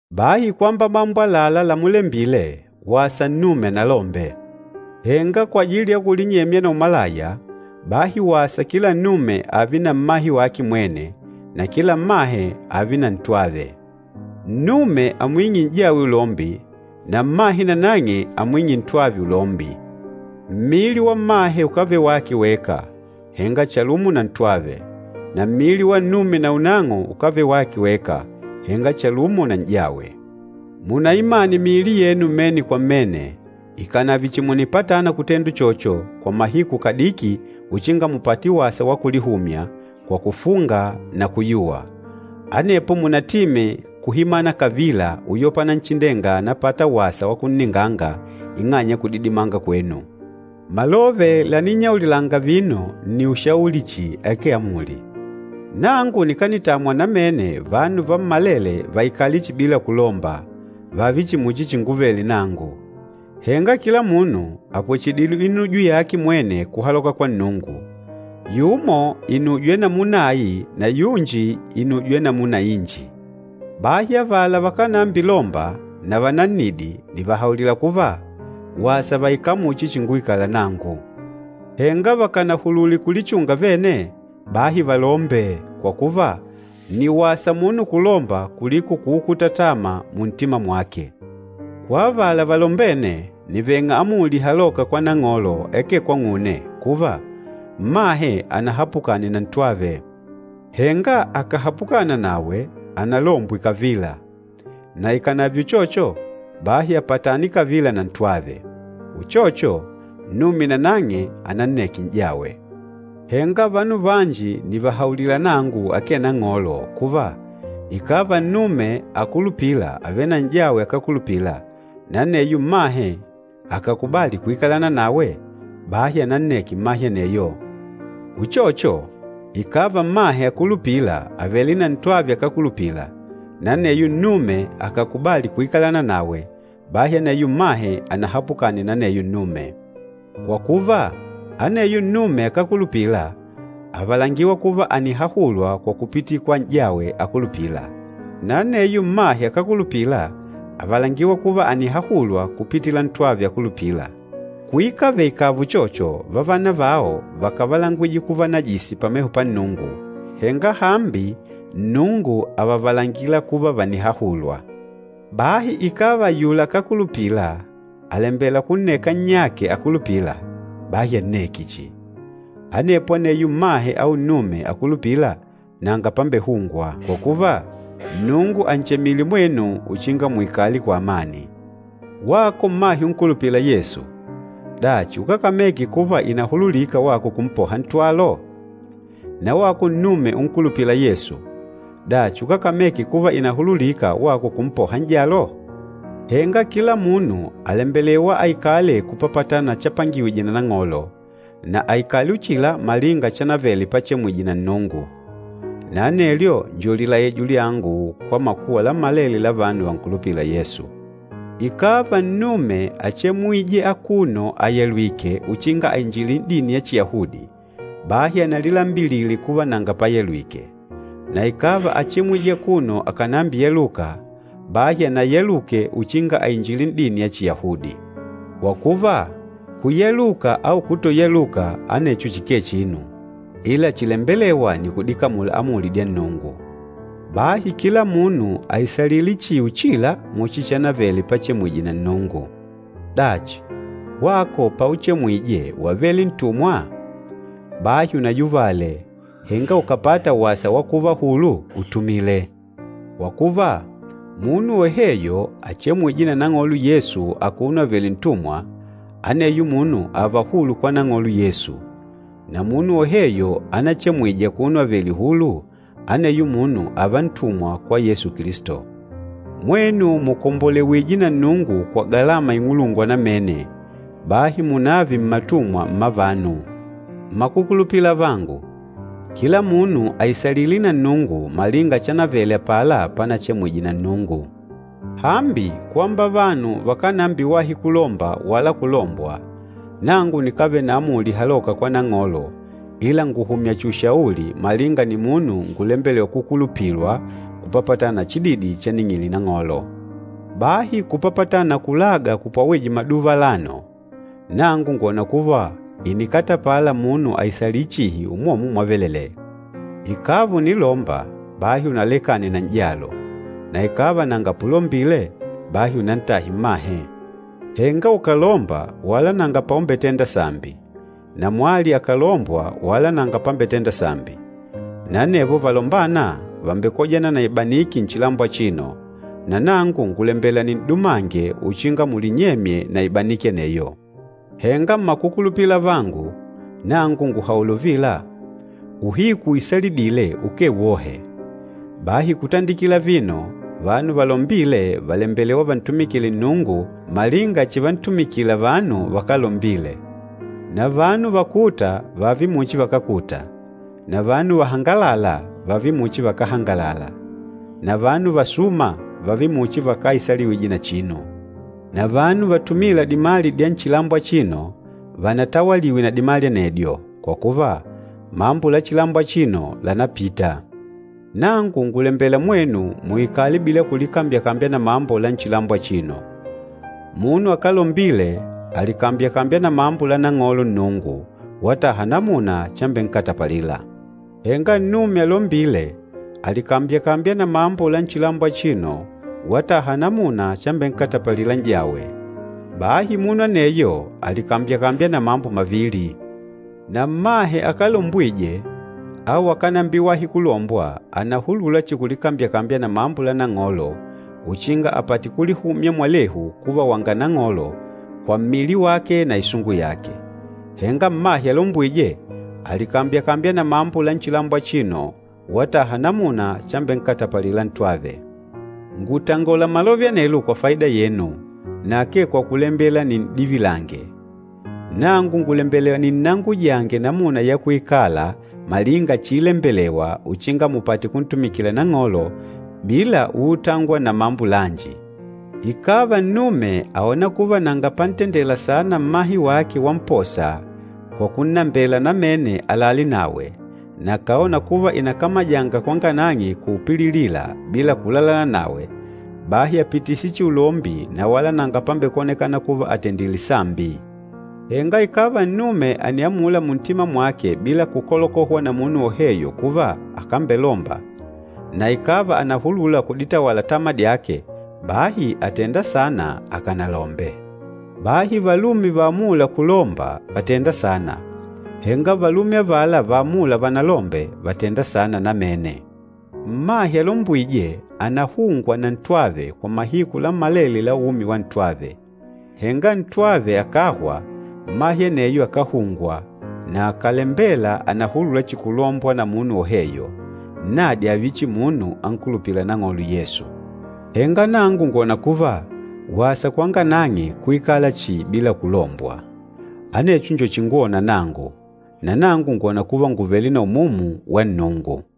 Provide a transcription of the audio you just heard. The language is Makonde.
Bahi kwamba mambo àlalá lamulembile, wasa nnume analombe. Henga kwajili ya kulinyemya na umalaya, bahi wasa kila nnume ààve na mmahe wake mwene, na kila mmahe ààve na ntwave. Nnume amwing'e n'jawe ulombi, na mmahe nanang'e amwing'e ntwave ulombi. Mmili wa mmahe ukávele wake weka, henga chalumo na ntwave, na mmili wa nnume naunang'o ukávele wake weka, henga chalumo na n'jawe. Munaimane miili yenu mmene kwa mmene, ikànave chihi mùnipatana kutenda uchocho kwa mahiku kadiki uchinga mupate wasa wa kulihumya, kwa kufunga na kuyuwa. Anepo munatime kuhimana kavila uyopa Nanchindenga ànapata wasa wa kunninganga ing'anya ya kudidimanga kwenu. Malove laninnyaulilanga vino nni ushauli chihi akee amuli. Nangu nikanitamwa namene vanu vammalele vaikale chihi bila kulomba, vààve chihi muchi chinguvele nangu. Henga kila munu àpwechedile inujo yake mwene kuhaloka kwa Nnungu, yumo inujo ya namuna ai na yunji inujo ya namuna inji. Bahi avala vakánambilomba na vanannidi nìvahaulila kuva, wasa vaikale muchi chinguikala nangu. Henga vakànahulule kulichunga vene, bahi valombe, kwa kuva nni wasa munu kulomba kuliko kuukuta tama muntima mwake. Kwa avala valombene, nìveng'a amuli ihalôka kwa Nang'olo akee kwang'une kuva, mmahe anahapukane na ntwave. Henga akàhapukana nawe, analombwe kavila, na ikànave uchocho, bahi apatane kavila na ntwave. Uchocho, nnume nanang'e ananneke n'jawe. Henga vanu vanji nìvahaulila nangu akee Nang'olo kuva, ikàva nnume akulupîla àvele na n'jawe akákulupila, na aneyo mmahe akàkubali kuikalana nawe, bahi ananneke mmahe aneyo. Uchocho, ikàva mmahe akulupîla àvele na ntwave akákulupila, na aneyo nnume akàkubali kuikalana nawe, bahi aneyo mmahe anahapukane na aneyo nnume. Kwa kuva, aneyo nnume akákulupila àvalangiwa kuva ànihahulwa kwa kupitila kwa n'jawe akulupîla. Na aneyo mmahe akákulupila àvalangiwa kuva ànihahulwa kupitila ntwave akulupîla. Kuikave ikààva uchocho, vavana vao vákavalangwije kuva najisi pameho pa Nnungu, henga hambi Nnungu àvavalangila kuva vànihahulwa. Bahi ikàva ayula akákulupila àlembela kunneka nnyake akulupîla, bahi anneke chihi. Anepo aneyo mmahe au nnume akulupîla nanga pambehungwa. Kwa kuva, Nnungu ànchemile mwenu uchinga muikale kwa amani. Wako mmahe unkulupîla Yesu, dachi ukákameke kuva ìnahululika wako kumpoha ntwalo? Na wako nnume unkulupîla Yesu, dachi ukákameke kuva ìnahululika wako kumpoha n'jalo? Henga kila munu àlembelewa aikale kupapatana na chapangiwije na Nang'olo, na aikale uchila malinga chanavele pachemwije na Nnungu. Na anelyo njo lilaijo lyangu kwa makuwa lammalele la vanu vankulupîla Yesu. Ikàva nnume áchemwije akuno ayalwìkè uchinga ainjile n'dini ya Chiyahudi, bahi analilambilile kuva nanga payalwike. Na ikàva áchemwije akuno akànambiyaluka, bahi anayaluke uchinga ainjile n'dini ya Chiyahudi. Kwa kuva, kuyaluka au kutoyaluka anecho chikee chinu, ila chilembelêwa nni kudikamula amuli dya Nnungu. Bahi kila munu aisalile chihi uchila muchi chanavele pachemwije na Nnungu. Dachi, wako pauchemwije wavele ntumwa? Bahi unayuvale, henga ukàpata wasa wa kuva hulu, utumile. Kwa kuva, munu woheyo achemwîje na Nang'olo Yesu akuno avèlè ntumwa, aneyo munu ààva hulu kwa Nang'olo Yesu. Na munu woheyo anachemwije akuno avèlè hulu, aneyo munu ààva ntumwa kwa Yesu Kilisto. Mwenu mùkombolewije na Nnungu kwa galama ing'ulungwa namene, bahi munave mmatumwa mma vanu. Mmakukulupila avangu, kila munu aisalile na Nnungu malinga chanavele apala panachemwije na Nnungu. Hambi, kwamba vanu vakánambiwahi kulomba wala kulombwa, nangu nikávele na amuli ihalôka kwa Nang'olo ila ngùhumya chihi ushauli malinga nimunu ngulembelêwa kukulupilwa kupapatana na chididi chaning'ile Nang'olo. Bahi kupapatana na kulaga kupwawije maduva alano, nangu ngwòna kuva ìnikatapala munu aisalile chihi umwomwo mwavelelee. Ikàva ùnilomba, bahi unalekane na n'jalo. Na ikàva nanga pulombile, bahi unantahe mmahe. Henga ukàlomba wala nanga paumbetenda sambi, na mwali akàlombwa wala nanga pambetenda sambi. Na anevo valombâna vàmbekojana na ibaniki nchilambo achino, na nangu ngùlembela nin'dumange uchinga mulinyemye na ibaniki aneyo. Henga mmakukulupila avangu, nangu ngùhaula uvila, uhiku uisalidîle ukee wohe. Bahi kutandikila vino vanu valombîle vàlembelewa vantumikile Nnungu malinga chivantumikila vanu vakálombile. Na vanu vakûta vààve muchi vakákuta, na vanu vahangalâla vààve muchi vakáhangalala, na vanu vasûma vààve muchi vakáisaliwije na chinu. Na vanu vatumîla dimali dya nchilambo achino, vanatawaliwe na dimali anedyo. Kwa kuva, mambo la chilambo achino lànapita. Nangu ngùlembela mwenu muikale bila kulikambyakambya na mambo la nchilambo achino. Munu akálombile àlikambyakambya na mambo la Nang'olo Nnungu wataha namuna chambenkatapalila. Henga nnume alombîle àlikambyakambya na mambo la nchilambo achino wataha namuna chambenkatapalila n'jawe, bahi munu aneyo àlikambyakambya na mambo mavili. Na mmahe akálombwije au akánambiwahi kulombwa ànahulula chihi kulikambyakambya na mambo la Nang'olo uchinga apate kulihumya mwalehu kuva wanga Nang'olo, kwa mmili wake na isungu yake. Henga mmahe alombwîje, àlikambyakambya na mambo la nchilambo achino, wataha namuna chambenkatapalila ntwave. Ngùtangola malove anelo kwa faida yenu, na akee kwa kulembela nin'divilange. Nangu ngùlembela ninnangujange namuna ya kuikala malinga chiilembelewa uchinga mupate kuntumikila Nang'olo bila uutangwa na mambo lanji. Ikàva nnume àona kuva nanga pantendela saana mmahe wake wamposa kwa kunnambela namene alale nawe, na akàona kuva ìnakamajanga kwanga nang'e kulipililila bila kulalana nawe, bahi apitise chihi ulombi na wala nanga pambekwonekana kuva àtendile sambi. Henga ikàva nnume àniamula muntima mwake bila kukolokohwa na munu woheyo kuva akambelomba, na ikàva ànahulula kuditawala tama dyake, bahi àtenda saana akanalombe. Bahi valume vaamûla kulomba vàtenda saana, henga valume avala vaamûla vanalombe vàtenda saana namene. Mmahe alombwîje ànahungwa na ntwave kwa mahiku lammalele la umi wa ntwave. Henga ntwave akàhwa, mmahe aneyo akáhungwa, na akàlembela ànahulula chihi kulombwa na munu woheyo, nnadi ààve chihi munu ankulupîla Nang'olo Yesu. Henga nangu ngwòna kuva, wasa kwanga nang'e kuikala chihi bila kulombwa. Anecho njo chingwona nangu, nanangu ngwòna kuva ngùvele na Umumu wa Nnungu.